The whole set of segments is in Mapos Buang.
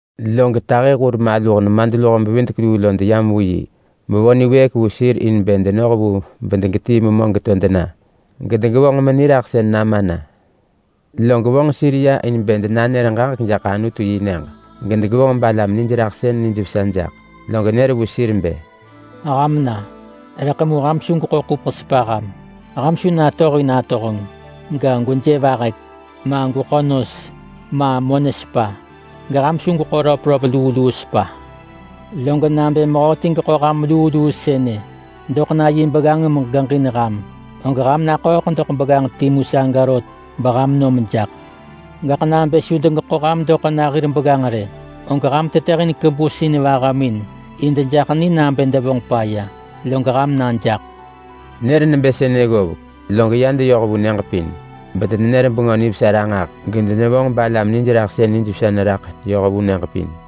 Log tahi hur maluh nemadluho-bevidek-luu lo deyam vu yi bevo niwëëk vu sir in bë denoh vu bedegetii memö geto dena, gedegevonġ meniraḳsën nama na. Log vonġ sir ya in bë denanër ġaġek jaḳ Anutu-yi-nyëġ, gedegevonġ balam nijraḳsën nijvesa jaḳ nah. Log nër vu sir bë, “Ham na, rëḳ mu ham su gweḳo ḳupeḳ sepa ham. Ham su natohin atohenġ, ga, gweje vahek, ma gweḳo nos, ma monë sepa. Geham su gweḳo röpröp luu luu sepa. Log nabë mehöti geḳo ham luu luu sënë doḳ na yi begganġ megeġin ham, og ham naḳööḳ doḳ begganġ timu saga rot beham nom jaḳ. Gaḳ nabë su degeḳo ham doḳ na hir begganġ rë, og ham tetëhin kebus in vahamin in dejaḳ ni nabë devonġ paya, log ham na jaḳ.” Nër nebë sënë ggovek, log ya deyoh vu nyëġ pin. Bedenenër Bengö Nivesa ranġah, gedenevonġ balam nijraḳsën nijvesa neraḳ yoh vu nyëġ pin.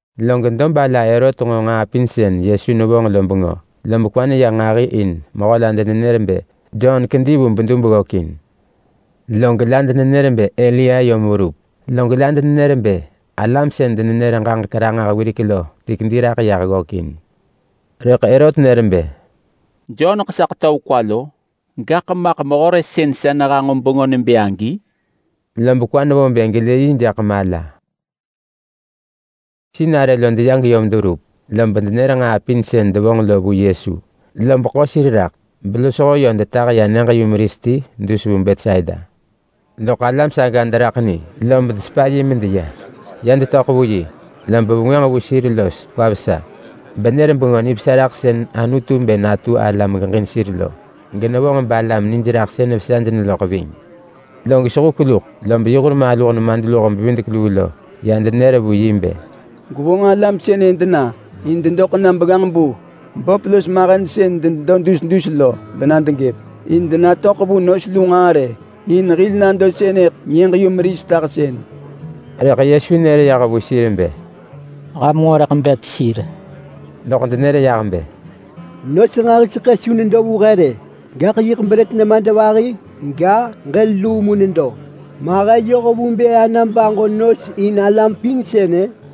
Log dob ala Herot nġo nġaa pin sën Yesu nevonġ lo bengö, lob kwa neya nġahi in mehö la denenër bë Jon kedi vu bedub ggökin. Log la denenër bë Elia yom verup. Log la denenër bë alam sën denenër ġaġek ranġah wirek lo ti kedi raḳ yah ggökin. Rëḳ Herot nër bë, “Joneḳ sa ḳetöv kwa lo. Gaḳ maḳ mehö re sën sa nehanġo bengö nebë agi?” Lob kwa nevo bë gelë yi jaḳ mala. Sinarë lo deya geyom deverup, lob denër nġaa pin sën devonġ lo vu Yesu. Lob ḳo sir raḳ belosho yö detah sir ya nyëġ-yumeris ti dus vu Betsaida. Loḳ alam saga deraḳ ni lob desepa yi medeya. Ya detöḳ vu yi, lob vengwënġ vu sir los kwa vesa, benër Bengö Nivesa raḳ sën Anutu bë natu ala megeġin sir lo. Genevonġ balam nijraḳsën nijvesa neraḳ ving. Log sehuk luḳ, lob yi hur maluh nemadluho-bevidek-luu lo ya denër vu yi bë, “Gwevonġ alam sënë dena in dedoḳ na begganġ-bu böp los mahen sën denedo dus dus lo bena degëp, in denatöḳ vu nos lu nġaa rë. In hil nado sënëḳ nyëġ-yumeris tahsën.” Rëḳ Yesu nër yah vu sir bë, “Ham nġo rëḳ bet sir.” Loḳ denër yah bë, “Nos nġahi su nedo vu he rë. Gaḳ yiḳ brët nemadvahi ga, ġël luu mu nedo. Ma he yoh vu bë ana baġo nos in alam pin sënë?”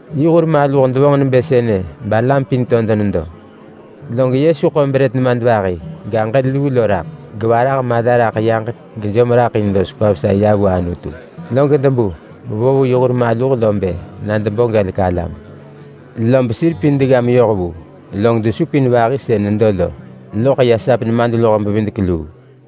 Yi hur maluh devonġ nebë sënë balam pin to denedo. Log Yesu ḳo brët nemadvahi ga, ġël luu lo raḳ, gevarah mala raḳ yaġek gejom raḳ in los kwa vesa ya vu Anutu; log debu bevo vu yi hur maluh lo bë na debo gelek alam. Lob sir pin degga meyoh vu, log desupin vahi sën nedo lo loḳ ya sap nemadluho-bevidek-luu.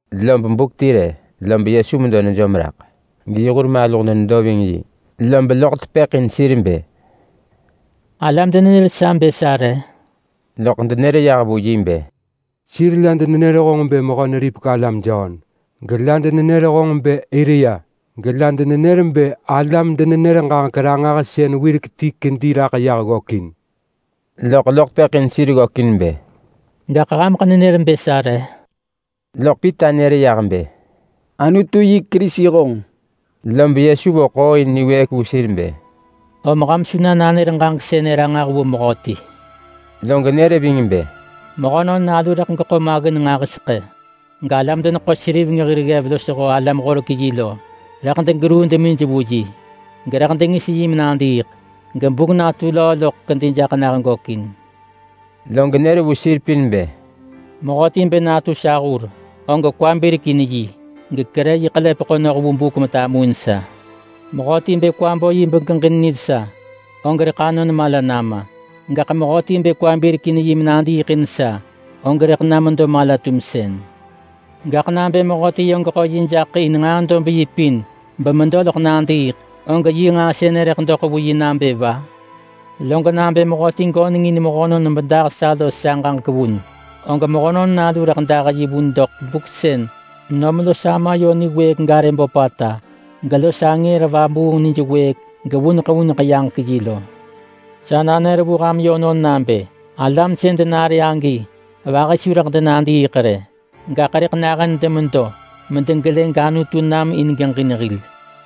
Lob buk ti rë lob Yesu medo nejom raḳ, geyi hur maluh denedo ving yi, lob loḳ tepëḳ in sir bë, “Alam denenër sa bë sa re?” Loḳ denër yah vu yi bë, “Sir la denenër honġ bë Mehö-neripek-alam Jon. Gela denenër honġ bë Elia. Gela denenër bë alam-denenër-ġaġek-ranġahsën wirek ti kedi raḳ yah ggökin.” Loḳ loḳ tepëḳ in sir ggökin bë, “Gaḳ hameḳ nenër bë sa re?” Loḳ Pita nër yah bë, “Anutu yi Kerisi honġ.” Lob Yesu vo ḳooin niwëëk vu sir bë, “Om ham su na nanër ġaġek sënë ranġah vu mehöti.” Log nër ving bë, “Mehönon Nalu rëḳ geḳo maggin nġahiseḳë, galam-deneḳo-seriveng hir ggev losho alam-horek-yi lo rëḳ degeruu demij vu yi, gerëḳ dengis yi menadiiḳ, gebuk natu löö loḳ kedi jaḳ nah gökin.” Log nër vu sir pin bë, “Mehöti bë natu sa hur, og kwa birek in yi gekerë yi ḳelepeḳo noh vu buk metamuin sa. Mehöti bë kwa bo yi begeġin nivesa, og rëḳ anon mala nama. Gaḳ mehöti bë kwa birek in yi menadiiḳ in sa, og rëḳ na medo mala-tumsën. Gaḳ nabë mehöti yö geḳo yi jaḳ in nġaa dob yi pin bemedo loḳ nadiiḳ, og yi nġaa sënë rëḳ doḳ vu yi nabë va? Log nabë mehöti göneng in mehönon bedah sa los sa ġaġek vun, og Mehönon Nalu rëḳ dah yi vun doḳ buk sën nom los Ama yö niwëëk garë böpata, gelos angër vabuung nij wëëk gevuneḳ vuneḳ yaġek yi lo. Sa nanër vu ham yönon nabë alam sën denare agi vahi su rëḳ denadiiḳ rë, gaḳ rëḳ nahën demedo medegelë gAnutu nam in geġin hil.”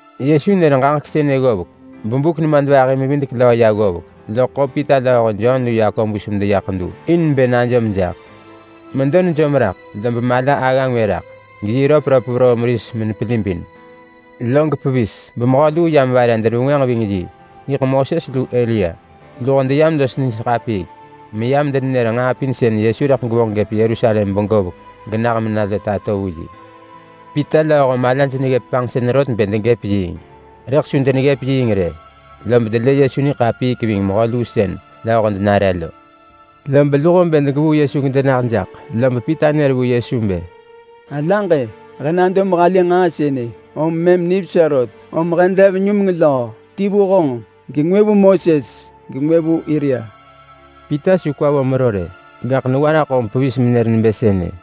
Yesu nër ġaġek sënë ggovek bebuk nemadvahi-mevidek-löö ya ggovek, loḳ ḳo Pita lööho Jon lu Yakobus medeya ḳedu, in bë najom jaḳ. Medo nejom raḳ, lob mala agga ngwë raḳ, geyi röpröp veroo meris nebë davës. Log pevis bemehö luu yam vare denevengwënġ ving yi. Yiḳ Moses lu Elia. Luho deyam los nij ḳapiik, meyam denenër nġaa pin sën Yesu rëḳ gevonġ gëp Yerusalem begovek genah mena lo tato vu yi. Pita lööho malaj neggëp panġsën rot bë degëp yiing. Rëḳ su deneggëp yiing rë, lob delë Yesu niḳapiik ving mehö luu sën lööho denare lo. Lob luho bë degevuu Yesu gedenah jaḳ, lob Pita nër vu Yesu bë, “Sa alaġ-e! He nado mehalë nġaa sënë om mëm nivesa rot. Om he dev numeng löö: Ti vu honġ, gengwë vu Moses, gengwë vu Elia.” Pita su kwa vo mero rë, gaḳ newa raḳ om pevis menër nebë sënë.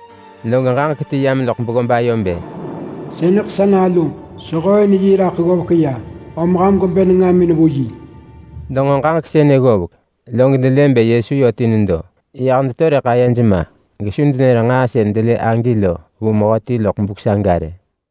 Log ġaġek ti yam loḳ beggob ayo bë, “Sënëḳ sa naluġ. Sehooin yi raḳ ggovek ya. Om ham gwebë nengamin vu yi.” Denġo ġaġek sënë ggovek, log delë bë Yesu yö ti nedo. Lob ayej ma gesu denër nġaa sën delë agi lo vu mehöti loḳ buk saga rë.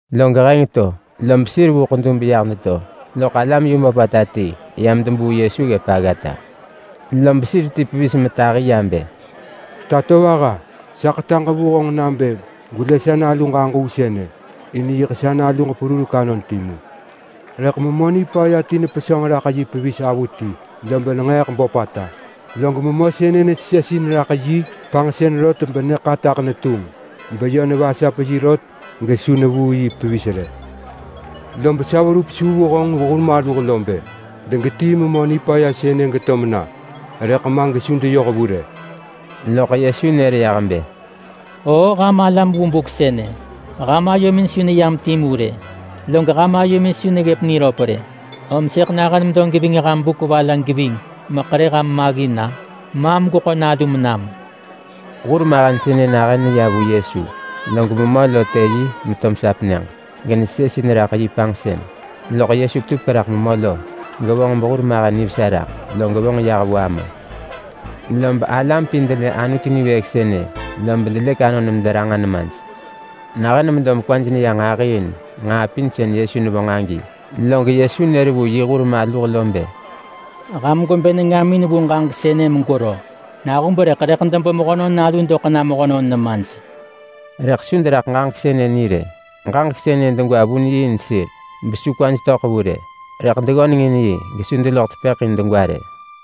Log heng to, lob sir vu ḳedu beyah deto, loḳ alam yu böpata ti yam debuu Yesu ggëp aggata. Lob sir ti pevis metahi ya bë, “Tatovaha, sa ḳetaġ vu honġ nabë gwelë sa naluġ aġuu sënë. In yiḳ sa naluġ perurek anon timu. Rëḳ memö nipaya ti nepesönġ raḳ yi pevis avuti, lob nenġeeḳ böpata. Log memö sënë nesesesin raḳ yi panġsën rot lob nyë ḳataḳ netunġ. Beyö nevasap yi rot, gesu nevuu yi pevis rë. Lob sa verup su vu honġ hur maluh lo bë degetii memö nipaya sënë geto mena, rëḳ ma gesu deyoh vu rë.” Loḳ Yesu nër yah bë, “Oo ham alam vu buk sënë, ham ayomin su neyam timu rë, log ham ayomin su neggëp niröp rë. Om sëḳ nahën medo geving ham buk va la geving meḳerë ham maggin-a? Maam gweḳo nalum nam.” Hurmahen sënë nahën neya vu Yesu, log memö lo të yi to mesap nyëġ, genesesesin raḳ yi panġsën. Loḳ Yesu petupek raḳ memö lo, gevonġ behurmahen nivesa raḳ, log vonġ yah vu ama. Lob alam pin delë Anutu niwëëk sënë, lob delëk anon mederanġa nemaj. Nahën medo mekwaj neya nġahi in nġaa pin sën Yesu nevonġ agi, log Yesu nër vu yi hur maluh lo bë, “Ham gwebë nengamin vu ġaġek sënë megwero! Nahub rëḳ rëḳ debo Mehönon Nalu doḳ na mehönon nemaj.” Rëḳ su deraḳ ġaġek sënë ni rë. Ġaġek sënë degwa vun yi in sir, besu kwaj töḳ vu rë. Rëḳ deggöneng in yi gesu deloḳ tepëḳ in degwa rë.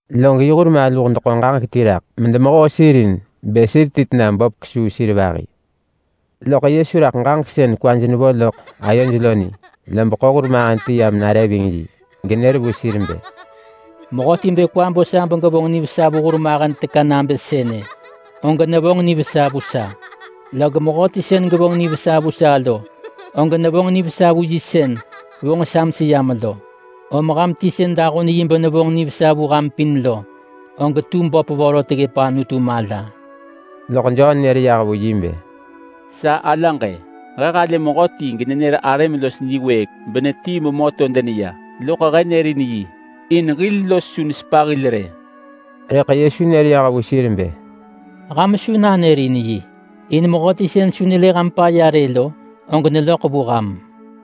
Log yi hur maluh deḳo ġaġek ti raḳ medemehoo sir in bë sir ti tena böp kesuu sir vahi. Loḳ Yesu raḳ ġaġek sën kwaj nevo loḳ ayoj lo ni, lob ḳo hurmahen ti yam nare ving yi genër vu sir bë, “Mehöti bë kwa bo sa begevonġ nivesa vu hurmahen teka nabë sënë, og nevonġ nivesa vu sa. Log mehöti sën gevonġ nivesa vu sa lo, og nevonġ nivesa vu yi sën vonġ sa meseyam lo. Om ham ti sën dahun yi benevonġ nivesa vu ham pin lo, og tu böp vorot ggëp Anutu mala. Loḳ Jon nër yah vu yi bë, “Sa alaġ-e! He halë mehöti genenër arëm los niwëëk benetii memö to deneya, loḳ he nërin yi in hil los su nesepa hil rë.” Rëḳ Yesu nër yah vu sir bë, “Ham su nanërin yi, in mehöti sën su nelë ham paya rë lo, og neloḳ vu ham.”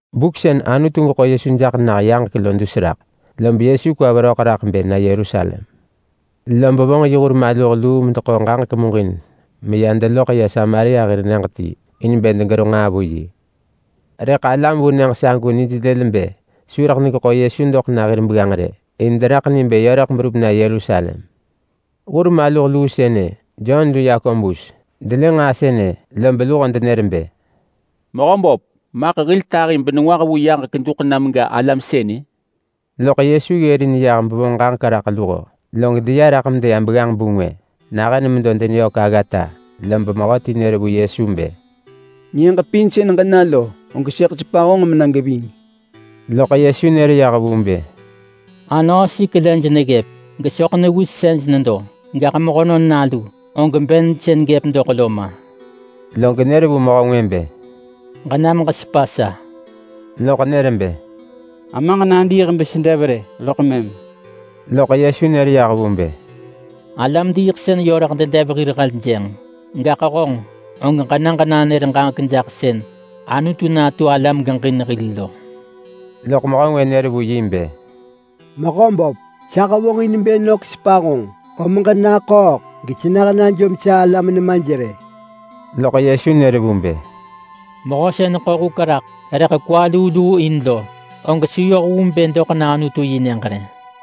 Buk sën Anutu geḳo Yesu jaḳ nah yaġek lo dus raḳ, lob Yesu kwa veröḳ raḳ bë na Yerusalem. Lob vonġ yi hur maluh luu medeḳo ġaġek muġin meya deloḳ ya Samaria hir nyëġ ti in bë degero nġaa vu yi. Rëḳ alam vu nyëġ sagu nij lël bë su rëḳ degeḳo Yesu doḳ na hir begganġ rë. In deraḳ ni bë yö rëḳ berup na Yerusalem. Hur maluh luu sënë, Jon lu Yakobus, delë nġaa sënë, lob luho denër bë, “Mehöböp, maḳ hil tahi nengwah vu yaġek duḳ nam ga alam sënë?” Loḳ Yesu ggërin yah bevonġ ġaġek raḳ luho. Log deya raḳ medeya begganġ-bu ngwë. Nahën medo deneyök aggata, lob mehöti nër vu Yesu bë, “Nyëġ pin sën ġena lo, og sëḳ sepa honġ mena geving.” Loḳ Yesu nër yah vu bë, “Anöösik lej neggëp, gesoḳ newisej nedo, gaḳ Mehönon Nalu, og ben sën gëp doḳ lo ma.” Log nër vu mehö ngwë bë, “Ġenam ġesepa sa.” Loḳ nër bë, “Amaġ nadiiḳ besedev rë loḳ mëm.” Loḳ Yesu nër vu bë, “Alam diiḳsën yö rëḳ dedev hir heljënġ. Gaḳ honġ, og ġena ġenanër ġaġek jaḳ sën Anutu natu ala megeġin hil lo.” Loḳ mehö ngwë nër vu yi bë, “Mehöböp, sa hevonġin bë nök sepa honġ, om ġenaḳööḳ gesenah najom sa alam nemaj rë. Loḳ Yesu nër vu bë, “Mehö sën ḳo huk raḳ rëḳ kwa luu luu in lo, og su yoh vu bë doḳ na Anutu-yi-nyëġ rë.”